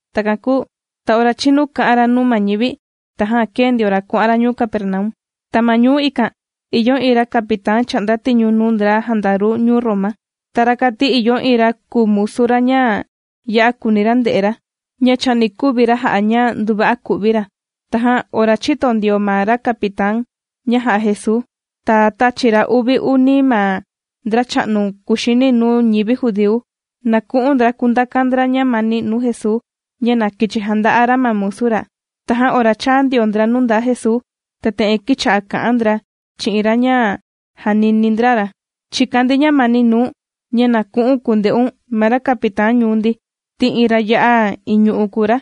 Takan kūu ta ora chīnu kā'an ra nuu ma ñivi, tajan kēe ndio ra kuà'an ra ñuu Capernaum. Ta ma ñuu ikan, ìyo iin ra capitán chà'nda tiñu nuu ndra jandaru ñuu Roma. Ta rakan ti, ìyo iin ra kùu musu ra ña ya'a kùuni ra nde'e ra, ña chani kuvi ra jà'a ña nduva'a ku'vi ra. Tajan ora chīto ndio ma ra capitán ña jà'a Jesuu, ta tāchi ra uvi uni ma ndracha'nu kuxini nuu ñivi judíu, na ku'un ndra kundakan ndra ñamani nuu Jesuu, ña na kichi janda'a ra ma musu ra. Tajan ora chāa ndio ndra nuu ndaa Jesuu, ta te'en kīcha'a kà'an ndra chi'in ra ña jànini ndra ra: ―Chìkan ndi ñamani nuu̱n, ña na ku'u̱n kutindeun ma ra capitán ñuu ndi, ti iin ra ya'a iñu'u kùu ra.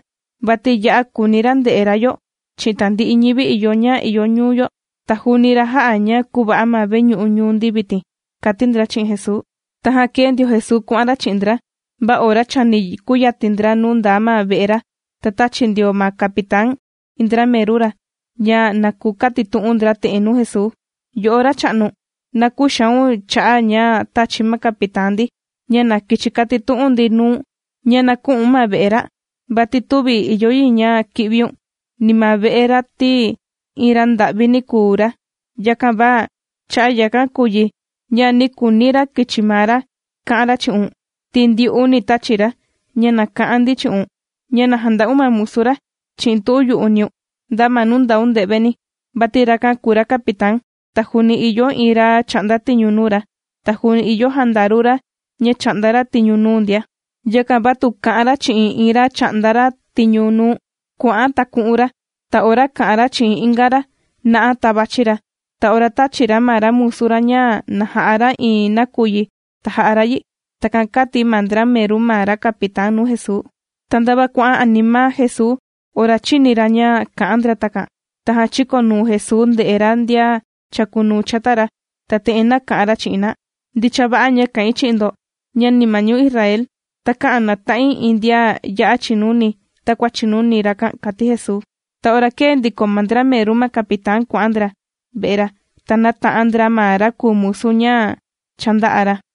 Vati ya'a kùuni ra nde'e ra yo chi'in tandi'i ñivi yo ña ìyo ñuu yo. Ta juu ra jā'a ña kūva'a ma veñu'u ñuu ndi vitin ―kàti ndra chi'in Jesuu. Tajan kēe ndio Jesuu kuà'an ra chi'in ndra, va ora chani kuyatin ndra nuu ndaa ma ve'e ra, ta tāchi ndio ma capitán iin ndra meru ra, ña na kukatitu'un ndra te'en nuu Jesuu: ―Yo'o Racha'nu, na küxaun cha'a' ña tāchi ma capitán ndi, ña na kichi katitu'un ndi nuu̱n, ña na kü'u̱n ma ve'e ra, vati tüvi ìyo yi ña ki'viun, ni ma ve'e ra, ti iin ra nda'vini kùu ra. Yakan va cha'a' yakan kùu yi, ña nī kuuni ra kichi maa ra ka'an ra chi'un, ti ndyu'uni tāchi ra ña na ka'an ndi chi'un ña na janda'un ma musu ra chi'in tu'un yu'uniun nda ma nuu ndaun nde'veni. Vati rakan kùu ra capitán, ta juuni ìyo iin ra chà'nda tiñu nuu ra, ta juuni ìyo jandaru ra ña chà'nda ra tiñu nuu ndia. Yakan va tu ka'an ra chi'in iin ra chà'nda ra tiñu nuu, “kua'an”, ta ku'un ra. Ta ora kà'an ra chi'in inga ra, “na'a”, ta vàchi ra. Ta ora tàchi ra ma ra musu ra ña na ja'a ra iin nakuyi, ta jà'a ra yi. ―Takan kāti ma ndra meru ma ra capitán nuu Jesuu. Ta ndava kuà'an anima Jesuu ora chīni ra ña kā'an ndra takan, tajan chīkonuu Jesuu ndē'e ra ndian chàkunuu chata ra, ta te'en nāka'an ra chi'in na: ―Ndicha va'a ña kà'in chi'in ndo ña, ni ma ñuu Israel takä'an nata'in iin ndian ya'a chìnuni takua chìnuni rakan ―kàti Jesuu. Ta ora kēe ndiko ma ndra meru ma capitán kuà'an ndra ve'e ra, ta nāta'an ndra ma ra kùu musu ña cha ndā'a ra.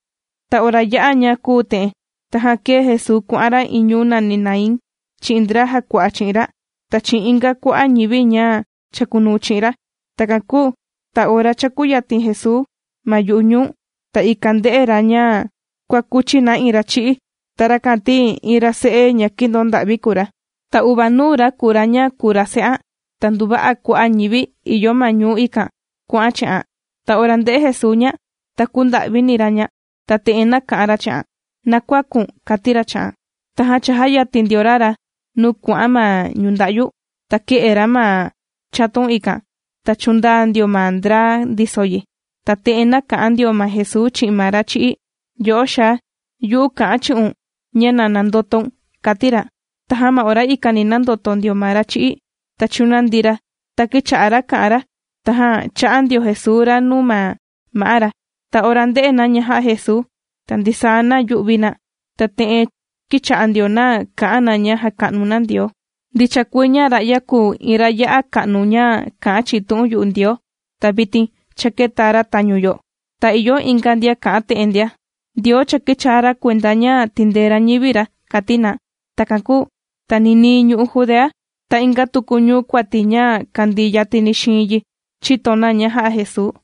Ta ora yā'a ña kūu te'en, tajan kēe Jesuu kuà'an ra iin ñuu nàni Naín, chi'in ndra jàkua'a chi'in ra, ta chi'in inga kua'a' ñivi ña chàkunuu chi'in ra. Takan kūu ta ora cha kūyatin Jesuu ma yu'u ñuu, ta ikan ndē'e ra ña kuàkuchi na iin ra chì'í. Ta rakan ti, iin ra se'e ña kìndonda'vi kùu ra. Ta uvanuu ra kùu ra ña kùu ra se'an. Ta nduva'a kua'a' ñivi ìyo ma ñuu ikan kuà'an chi'an ndia. Ta ora ndē'e Jesuu ña, ta kūnda'vini ra ña, ta te'en nāka'an ra chi'an: ―¡Na kuäku̱n! ―kàti ra chi'an. Tajan chājayatin ndio ra ra nuu kuà'an ma ñunda'yu, ta kē'e ra ma chatun ikan. Ta chūndaa ndio ma ndra ndiso yi. Ta te'en nāka'an ndio ma Jesuu chi'in ma ra chì'í: ―Yo'o xaa, yu'u kà'an chi'un ña na nandotoun ―kàti ra. Tajan ma ora ikani nāndoto ndio ma ra chī'í, ta chūnandi ra, ta kīcha'a ra kà'an ra. Tajan chā'a ndio Jesuu ra nuu ma ma'á ra. Ta ora ndē'e na ña jā'a Jesuu, ta ndisaa na yū'vi na, ta te'en kīcha'a ndio na kà'an na ña jàka'nu na Ndioo: ―Ndicha kuii, ña ra'ya kùu iin ra ya'a ka'nu ña kà'an chi'in tu'un yu'u Ndioo. Ta vitin cha kēta ra tañu yo. Ta ìyo inga ndian kà'an te'en ndia: ―Ndioo cha kīchaa ra kuenda ña tìndee ra ñivi ra ―kàti na. Takan kūu ta ninii ñu'u' Judea, ta inga tuku ñuu kuati ña kàndii yatini xiin yi chīto na ña jā'a Jesuu.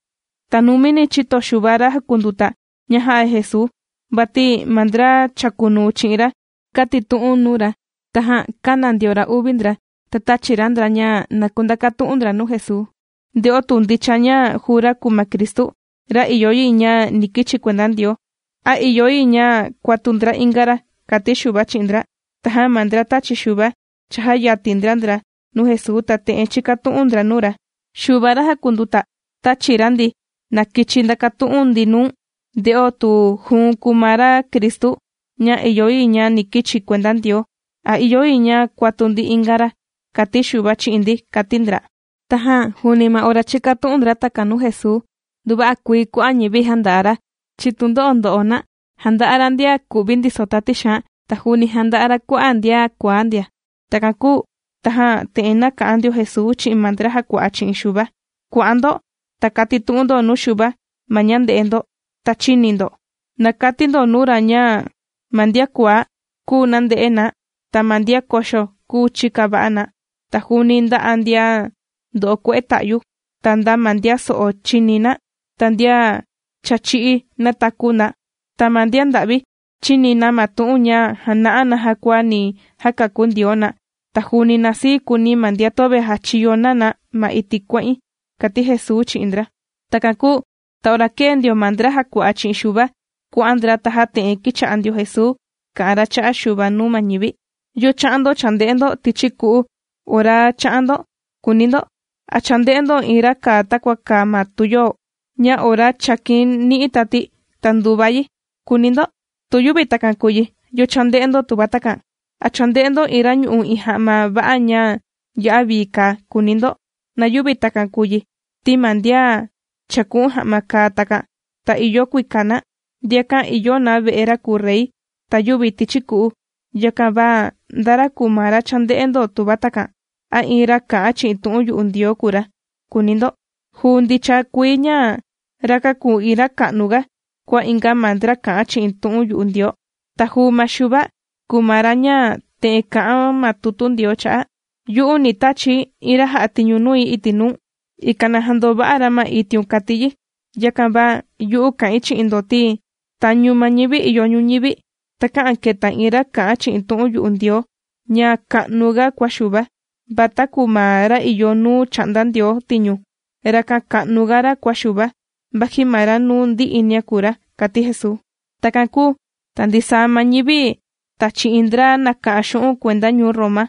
Ta numini chīto Xuva ra jàkunduta ña jā'a Jesuu, vati ma ndra chàkunuu chi'in ra kātitu'un nuu ra. Tajan kāna ndio ra uvi ndra, ta tāchi ra ndra, ña na kundakatu'un ndra nuu Jesuu, nde'o tu ndicha ña juu ra kùu ma Cristu, ra ìyo yi ña ni kichi kuenda Ndioo, a ìyo yi ña kuatu ndra inga ra, kàti Xuva chi'in ndra. Tajan ma ndra tāchi Xuva, chājayatin ndra ndra nuu Jesuu, ta te'en chīkatu'un ndra nuu ra: ―Xuva ra jàkunduta, tāchi ra ndi, na kichi ndakatu'un ndi nuu̱n, nde'o tu juu̱n kùu ma ra Cristu ña ìyo yi ña ni kichi kuenda Ndioo, a ìyo yi ña kuatu ndi inga ra, kàti Xuva chi'in ndi ―kàti ndra. Tajan juuni ma ora chīkatu'un ndra takan nuu Jesuu, nduva'a kuii kua'a' ñivi jānda'a ra chi'in tundo'o ndo'o na. Jānda'a ra ndian ku'vi ndiso tati xaan, ta juuni jānda'a ra kua'a' ndian kuaá ndia. Takan kūu tajan te'en nāka'an ndio Jesuu chi'in ma ndra jàkua'a chi'in Xuva: ―Kua'an ndo, ta katitu'un ndo nuu Xuva ma ña ndē'e ndo, ta chīni ndo. Na kati ndo nuu ra ña ma ndian kuaá, kùu nànde'e na, ta ma ndian koxo kùu chìka va'a na, ta juuni ndà'a ndian ndo'o kue'e ta'yu, ta nda ma ndian so'o, chìni na, ta ndian cha chī'í nātaku na, ta ma ndian nda'vi chìni na ma tu'un ña jàna'a naja kua ni jakakú Ndioo na. Ta juuni na sii kuuni ma ndian töve jàchiyo na na ma iti' kuà'in ―kàti Jesuu chi'in ndra. Takan kūu ta ora kēe ndio ma ndra jàkua'a chi'in Xuva kuà'an ndra, tajan te'en kīcha'a ndio Jesuu kà'an ra cha'a' Xuva nuu ma ñivi: ―¿Yo chā'an ndo chānde'e ndo tichi ku'u ora chā'an ndo?, kùuni ndo. ¿A chānde'e ndo iin ra kàa takua kàa ma tuyoo, ña ora chàkin ni'i tati, ta ndùva yi?, kùuni ndo. Tu yüvi takan kùu yi, ¿yo chānde'e ndo tuva takan? ¿A chānde'e ndo iin ra ñù'u iin ja'ma va'a ña ya'a vii kàa?, kùuni ndo. Na yüvi takan kùu yi, ti ma ndian chāku'un ja'ma kàa takan, ta ìyo kuika na, ndiakan ìyo na ve'e ra kùu rey ta yüvi tichi ku'u. Yakan va, ¿nda ra kùu ma ra chānde'e ndo tuva takan? ¿A iin ra kà'an chi'in tu'un yu'u Ndioo kùu ra?, kùuni ndo. Juu ndicha kuii ña, rakan kùu iin ra ka'nuga kua inga ma ndra kà'an chi'in tu'un yu'u Ndioo. Ta juu ma Xuva kùu ma ra ña te'en kà'an ma tutu Ndioo cha'a': Yu'u, ni tachi̱ iin ra jà'a tiñu nui iti' nuu̱n, ikan na jandova'a ra ma itiun, kàti yi. Yakan va yu'u kà'in chi'in ndo, ti tañu ma ñivi ìyo ñuñivi, takä'an keta iin ra kà'an chi'in tu'un yu'u Ndioo ña ka'nuga kua Xuva. Va taku ma ra ìyo nuu chà'nda Ndioo tiñu, rakan ka'nuga ra kua Xuva, vaji ma ra nuu ndi'inia kùu ra ―kàti Jesuu. Takan kūu ta ndisaa ma ñivi, ta chi'in ndra nàka'an xu'un' kuenda ñuu Roma,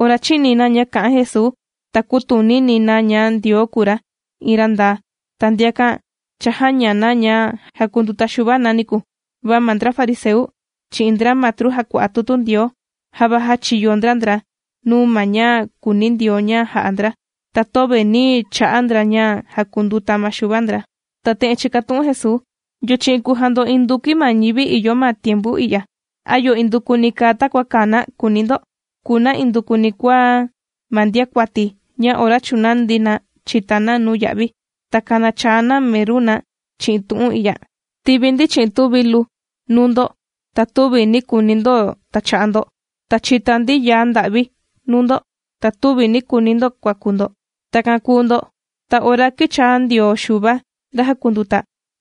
ora chīni na ña kā'an Jesuu, ta kūtunini na ña Ndioo kùu ra iin ra ndaa. Ta ndiakan cha jāña na ña jākunduta Xuva na niku. Va ma ndra fariseu, chi'in ndra matru jàkua'a tutu Ndioo, java jāchiyo ndra ndra nuu ma ña kùuni Ndioo ña jà'a ndra, ta töve nī cha'a ndra ña jàkunduta ma Xuva ndra. Ta te'en chīkatu'un Jesuu: ―¿Yo chi'in kùu jando indukui ma ñivi ìyo ma tiempu i'ya? ¿A yo indukuni kàa takua kàa na?, kùuni ndo. Kùu na indukuni kua ma ndiakuati, ña ora chūnandi na chìta na nuu ya'vi, ta kànachaa na meru na chi'in tu'un i'ya: “Tīvi ndi chi'in tuvilu nuu ndo, ta tüvi nī kuuni ndo tacha'a ndo, ta chīta ndi yaa nda'vi nuu ndo, ta tüvi nī kuuni ndo kuaku ndo.” Takan kùu ndo, ta ora kīchaa ndio Xuva ra jàkunduta,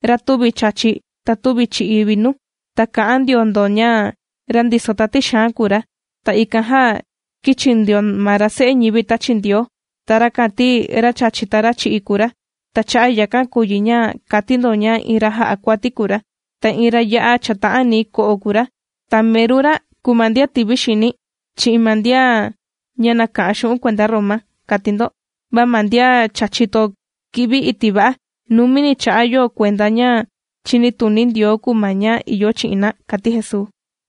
ra tüvi chàchi, ta tüvi chì'i vinu, ta kà'an ndio ndo ña ra ndiso tati xaan kùu ra. Ta ikan jan, kīchi ndio ma ra Se'e ñivi tāchi Ndioo, ta rakan ti ra chàchi, ta chì'i kùu ra. Ta cha'a' yakan kùu yi ña kàti ndo ña iin ra jà'a kuati kùu ra, ta iin ra ya'a chàta'ani ko'o kùu ra, ta meru ra kùu ma ndian tivi xini chi'in ma ndian ña nàka'an xu'un' kuenda ñuu Roma, kàti ndo. Va ma ndian cha chìto ki'vi iti' va'a, numini cha'a' yo kuenda ña chìnituni Ndioo kùu ma ña ìyo chi'in na ―kàti Jesuu.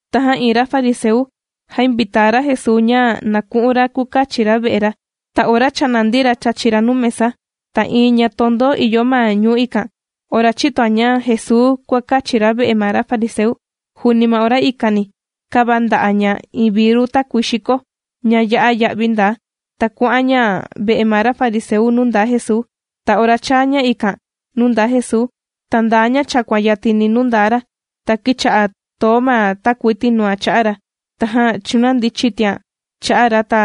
Tajan iin ra fariseu jāinvitaa ra Jesuu ña na ku'un ra kukachi ra ve'e ra. Ta ora cha nàndi ra chàchi ra nuu mesa, ta iin ña tondo ìyo ma ñuu ikan, ora chītoan ña Jesuu kuàkachi ra ve'e ma ra fariseu, juuni ma ora ikani kāvanda'a ña iin viru takuii xiko, ña ya'a ya'vi ndaa, ta kuà'an ña ve'e ma ra fariseu nuu ndaa Jesuu. Ta ora chāa ña ikan nuu ndaa Jesuu, ta ndaa ña chàkuan yatini nuu ndaa ra, ta kīcha'a too ma takuii tinuan cha'a ra, tajan chūnandi chitian cha'a ra, ta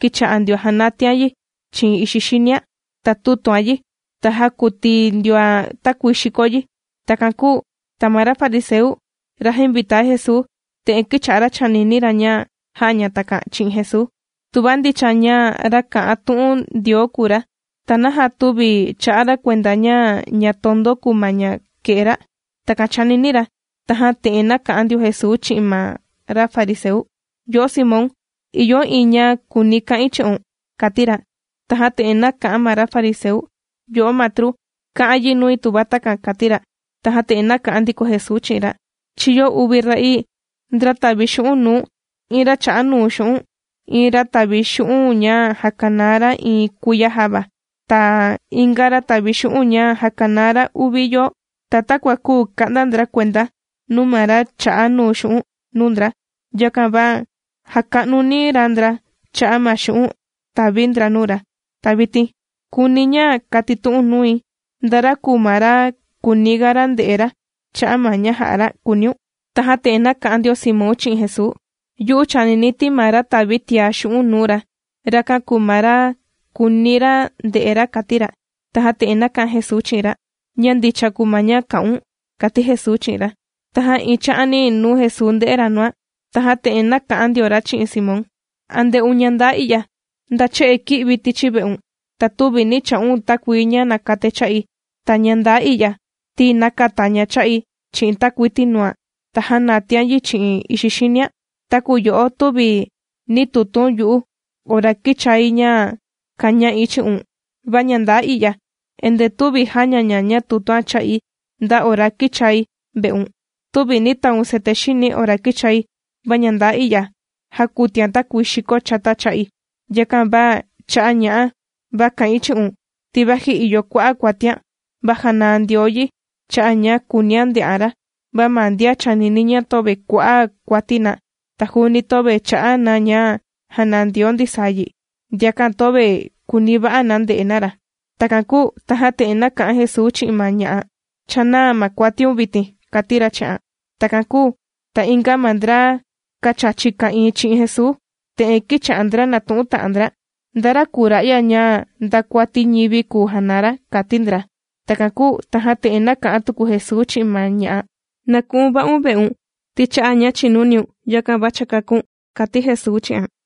kīcha'a ndioan jànatian yi chi'in ixi xinian. Ta tūtuan yi, ta jākuti ndioan takuii xiko yi. Takan kūu ta ma ra fariseu, ra jāinvitaa Jesuu, te'en kīcha'a ra chànini ra ña jà'a ña takan chi'in Jesuu: “Tuva ndicha ña ra kà'an tu'un Ndioo kùu ra, ¿ta naja tüvi chà'a ra kuenda ña ña tondo kùu ma ña kè'e ra?” Takan chànini ra. Tajan te'en nāka'an ndio Jesuu chi'in ma ra fariseu: ―Yo'o Simón, ìyo iin ña kùuni ka'in chi'un ―kàti ra. Tajan te'en nāka'an ma ra fariseu: ―Yo'o Matru, ka'an yi nui tuva takan ―kàti ra. Tajan te'en nāka'an ndiko Jesuu chi'in ra: ―Chīyo uvi ra'ii, ndra tàvi xu'un' nuu iin ra chà'a nuu xu'un'. Iin ra tàvi xu'un' ña jàkanaa ra iin kuiya java, ta inga ra tàvi xu'un' ña jàkanaa ra uvi yoo. Ta takua küu ka'nda ndra kuenda nuu ma ra chā'a nuu xu'un' nuu ndra, yakan va jāka'nuni ra ndra cha'a' ma xu'un' tàvi ndra nuu ra. Ta vitin kùuni̱ ña katitu'u̱n nui, ¿nda ra kùu ma ra kùuni ga ra nde'e ra cha'a' ma ña jā'a ra?, kùuniun. Tajan te'en nāka'an ndio Simón chi'in Jesuu: ―Yu'u chànini ti ma ra tàvi tiá xu'un' nuu ra, rakan kùu ma ra kùuniga ra nde'e ra ―kàti ra. Tajan te'en nāka'an Jesuu chi'in ra: ―Ña ndicha kùu ma ña kā'un ―kàti Jesuu chi'in ra. Tajan iin cha'ani nuu Jesuu ndē'e ra nuan, tajan te'en nāka'an ndio ra chi'in Simón: ―¿A ndè'un ña ndaa i'ya? Nda che'e kī'vi̱ tichi ve'un ta tüvi nī cha'un takuii ña nàkatai cha'i, ta ña ndaa i'ya ti nākata ña cha'i chi'in takuii tinuan ta jānatian yi chi'in ixi xinian. Taku yo'o tüvi nī tutu̱n yu'u ora kīchai ña kàña'i chi'un, va ña ndaa i'ya endee tüvi jàña ña ña tùtuan cha'i nda ora kīchai ve'un. Tüvi nī taun cete xini̱ ora kīchai, va ña ndaa i'ya, jākutian takuii xiko chata cha'i. Yakan va cha'a' ña'a, va kà'in chi'un ti vaji ìyo kua'a' kuatian, va jànaa Ndioo yi cha'a' ña kùunian nde'an ra, va ma ndian chànini ña töve kua'a' kuati na, ta juuni töve chà'a na ña janaa Ndioo ndisaa yi, ndiakan töve kùuni va'a na nde'e na ra. Takan kūu tajan te'en nāka'an Jesuu chi'in ma ña'a: ―Cha nàa ma kuatiun vitin ―kàti ra chi'an. Takan kūu ta inga ma ndra kàchachi ka'ìin chi'in Jesuu te'en kīcha'a ndra nàtu'un ta'an ndra: ―¿Nda ra kùu ra'ya ña nda kuati ñivi kùu janaa ra? ―kàti ndra. Takan kūu tajan te'en nāka'an tuku Jesuu chi'in ma ña'a: ―Na ku'un va'un ve'un ti cha'a' ña chìnuniun, yakan va cha kākún. ―Takan kàti Jesuu chi'an.